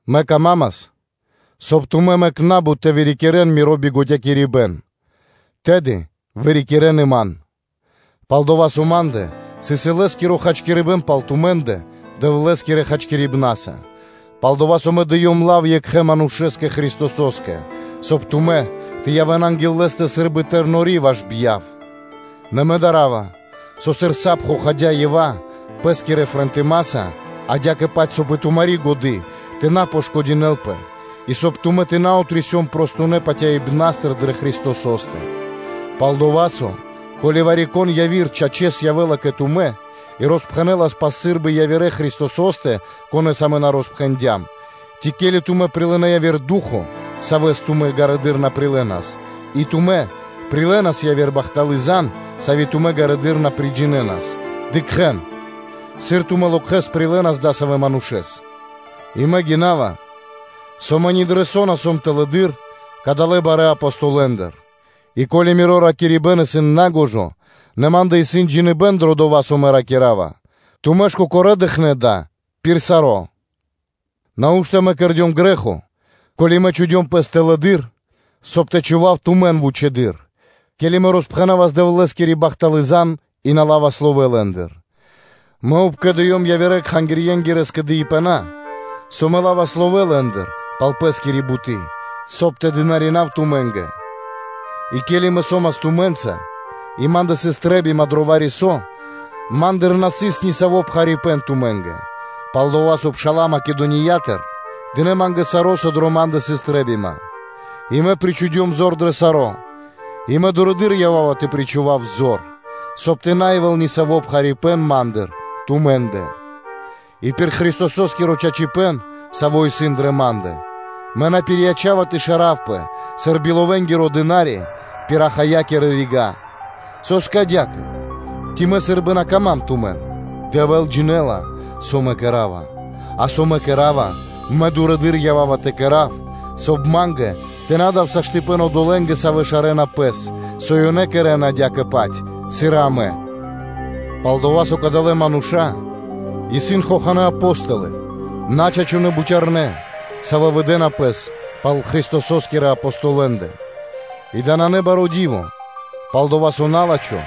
Мэ камамас, соб (кай) тумэ́ мэк на́бут тэ вырикирэн миро бигодякирибэн; тэды вырикирэн и ман. Пал-дова́ со ма́ндэ сыс илэ́скиро хачкирибэ́н пал тумэ́ндэ Дэвлэ́скирэ хачкирибнаса, пал-дова́ со мэ дыём лав (ангрустякирдём тумэн) Екхэ́ Манушэ́скэ, Христосо́скэ, соб (кай) тумэ́ тэ явэ́н анги́л Лэ́стэ сы́рбы патывалы́ тэрнори́. Нэ мэ дарава, со, сыр сап хохадя Ева пэ́скирэ фротыма́са, адя́кэ-паць, соб (кай) и тумари́ годы́ тэ на пошкодинэлпэ и, соб (кай) тумэ́ тэ на отрисён простонэ патяибнастыр дрэ Христосо́стэ. Пал-дова́ со, ко́ли вари-кон яви́р, чачэс, явэ́лас кэ тумэ́ и роспхэнэлас пал сы́рбы явирэ́ Христо́стэ, конэ́с амэ на роспхэндям, ци ко́ли тумэ́ прилынэ́ яви́р Ду́хо (Фа́но), Савэс тумэ́ ґарыдыр на прилэнас; и тумэ́ прилэнас яви́р бахталы́ зан (звесь), сави́ тумэ́ ґарэдыр на приджинэнас, – дыкхэ́н: сыр тумэ́ локхэс прилэнас дасавэ́ манушэ́с! И мэ гинава, со мэ ни дро со на сом тэлэды́р кадалэ́ барэ́ Апостолэндыр И ко́ли миро ракирибэ́н исын нагожо, нэ ма́ндэ исын джиныбэ́н дро дова́, со мэ ракира́ва: тумэ́ ж кокорэ́ дыкхнэ́ дава́ пир саро́. Нау́што кэрдём мэ грэ́хо, ко́ли мэ чхудём пэс тэлэды́р, соб (кай) тэ чхував тумэн вучэды́р, ке́ли мэ роспхэнавас Дэвлэ́скири бахталы́ зан (звесь) и мэ на лавас ловэ́ лэ́ндыр? Мэ обкэдыём явирэ-кхангирья́кирэ скэдыибэна, со мэ лавас ловэ́ лэ́ндыр пал пэ́скири буты́, соб (кай) тэ дынаринав тумэ́нгэ. И ке́ли мэ со́мас тумэ́нца и ма́ндэ сыс трэ́бима дро вари-со, ма́ндыр на сыс ни саво́ пхарипэ́н тумэ́нгэ, пал-дова́ со пша́ла Македониятыр дынэ́ ма́нгэ саро́, дро со ма́ндэ сыс трэ́бима, и мэ причхудём зор дро саро́ и мэ дурэды́р ява́ва тэ причхував зор, соб (кай) тэ на явэ́л ни саво́ пхарипэ́н ма́ндыр тумэ́ндэ. И пир Христосо́скиро чачипэ́н, саво́ исын дрэ ма́ндэ, мэ на́ пирияча́ва тэ шаравпэ сыр биловэнгиро дына́ри пир Ахаякирэ рига́. Со́скэ адя́кэ? Ци тумэ́ на сан дро́га ма́нгэ? Дэвэ́л джинэ́ла, со мэ кэра́ва. А со мэ кэра́ва, мэ дурэды́р ява́ва тэ кэра́в, соб (кай) ма́нгэ тэ на дав саштыпэн (возможность/ваканцыя) одолэ́нгэ, савэ́ шарэна пэс, со ёнэ кэрэ́на адя́кэ-паць, сыр и амэ. Пал-дова́ со кадалэ́ мануша́ исын хоханэ́ Апо́столы, начачунэ бутярнэ́, савэ́ выдэна пэс пал Христосо́скирэ Апостолэндэ. И дава́ нанэ баро́ ди́во, пал-дова́ со на́лачхо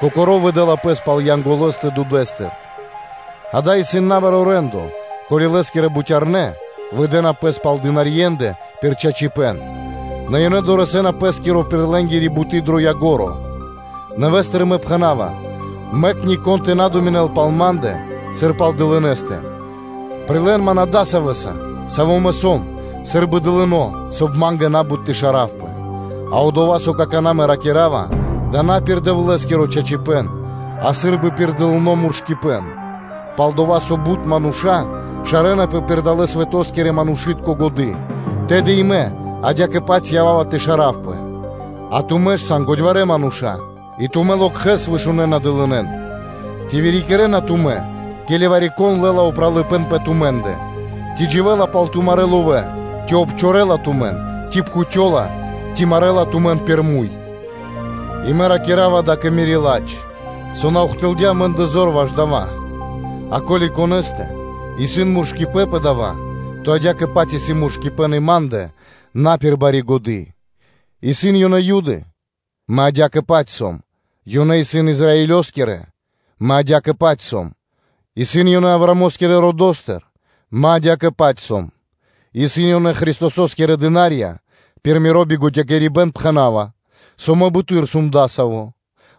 кокоро́ выдэла пэс пал Янголостэ дудэ́стыр (свэто́стыр). Дава́ исын набаро́ рэ́ндо, ко́ли лэ́скирэ бутярнэ́ выдэна пэс пал дынарье́ндэ пир чачипэ́н; нэ ёнэ дорэсэ́на пэ́скиро пир лэ́нгири буты́ дро ко́нцо (дро яго́ро). Нэвэ́стыр мэ пхэна́ва: мэк нико́н тэ на думинэл пал ма́ндэ сыр пал дылынэстэ, прилэ́н ман адасавэса, саво́ мэ сом – сы́рбы дылынэса, соб (кай) ма́нгэ на́бут тэ шаравпэ. А дова́, со мэ какана́ ракира́ва, дава́ исын на пир Дэвлэ́скиро чачипэ́н, а сы́рбы пир дылыно́ муршыпэн. Пал-дова́ со бут мануша́ шарэнапэ пир далэ́-свэто́скирэ манушы́тко годы́, тэды и мэ адя́кэ-паць ява́ва тэ шаравпэ. А тумэ́ ж сан годьварэ́ мануша́, и тумэ́ локхэс вышунэна дылынэн. Ци вырикирэна тумэ́, ке́ли вари-кон лэ́ла упралыпэ́н пэ тумэ́ндэ, ци дживэ́ла пал тумарэ́ ловэ́, ци обчорэла тумэн, ци пхутёла, ци марэла тумэн пир муй? И мэ ракира́ва дава́ кэ мири́ ладж, со на ухтылдя амэ́ндэ зор ваш дава́; а ко́ли вари-конэ́стэ исын муршыпэн пэ дава́, то адя́кэ-паць исын муршыпэн и ма́ндэ на пир бари годы́. Исын ёнэ Юды? Мэ адя́кэ-паць сом. Исын ёнэ Израилёскирэ? Мэ адя́кэ-паць сом. Исын ёнэ Авраамо́скирэ родо́стыр? Мэ адя́кэ-паць сом. Исын ёнэ Христосо́скирэ дына́рья? Пир миро бигодякирибэн пхэна́ва, со мэ буты́р сом дасаво: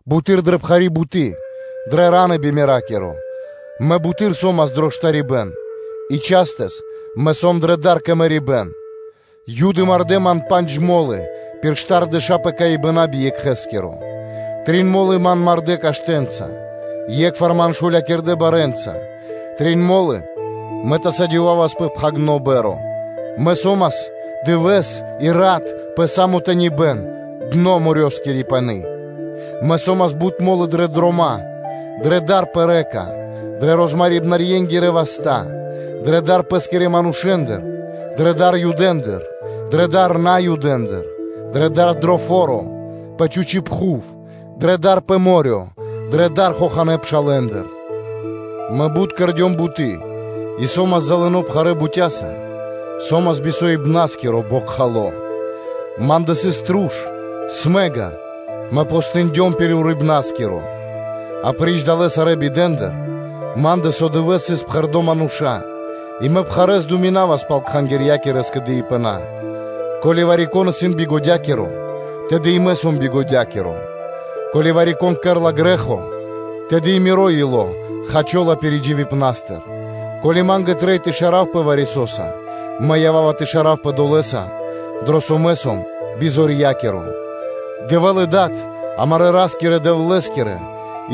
буты́р дрэ пхари́ буты́, дрэ фра́нсы (ра́ны) би меракиро, мэ буты́р со́мас дро штарибэ́н, и частэс мэ сом дрэ дар кэ мэрибэ́н. Юды мардэ́ ман пандж мо́лы пир штардэша́ пэкаибэна би екхэскиро. Трин мо́лы ман мардэ́ каштэнца, е́кхвар ман шулякирдэ барэ́нца, трин мо́лы мэ тасадёвавас пэ пхагирды́ па́рма (кораблё), мэ со́мас дывэ́с и рат пэ са́мо тэнибэ́н (дно) дро морёскири пани́: мэ со́мас бут мо́лы дрэ дрома́, дрэ дар пэ рэка (лэнь), дрэ розмарибнэнгирэ васта́, дрэ дар пэ́скирэ манушэ́ндыр, дрэ дар Юдэндыр, дрэ дар Наюдэндыр: дрэ дар дро фо́ро, пэ чхучи́ пхув, дрэ дар пэ мо́рё (дэрья́в), дрэ дар хоханэ́ пшалэ́ндыр; мэ бут кэрдём буты́ и со́мас залыно (залымо) пхарэ́ бутяса, со́мас бисоибнаскиро, бокхало. Ма́ндэ сыс труш (смэга); мэ постиндём пир шыл и би идякиро. Апри́ч далэ́ сарэ́ пиридживибэна рига́тыр, ма́ндэ со дывэ́с сыс пхэрдо́ мануша́ и мэ пхарэ́с думинавас пал кхангирья́кирэ скэдыибэна. Ко́ли вари-кон исын бигодякиро, тэды и мэ сом бигодякиро; ке́ли вари-кон кэрэ́ла грэ́хо, тэды и миро ило́ хачола пиридживипнастыр. Ко́ли ма́нгэ трэй тэ шаравпэ вари-со́са, мэ ява́ва тэ шаравпэ долэса, дро со мэ сом бизорья́киро. Дэвэ́л и Дад амарэ́ Ра́скирэ-Дэвлэ́скиро,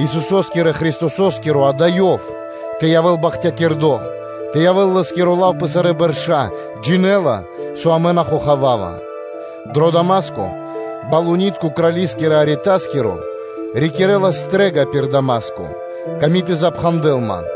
Исусо́скирэ Христосо́скиро – ґа́да, Ёв, тэ явэ́л бахтякирдо́, тэ явэ́л Лэ́скиро лав пэ сарэ́ бэрша́, джинэ́ла, со мэ на хохавава. Дро Дама́ско Крали́скирэ Аретаскиро рикирэлас стрэ́га пир Дама́ско, ками́ тэ запхандэл ман;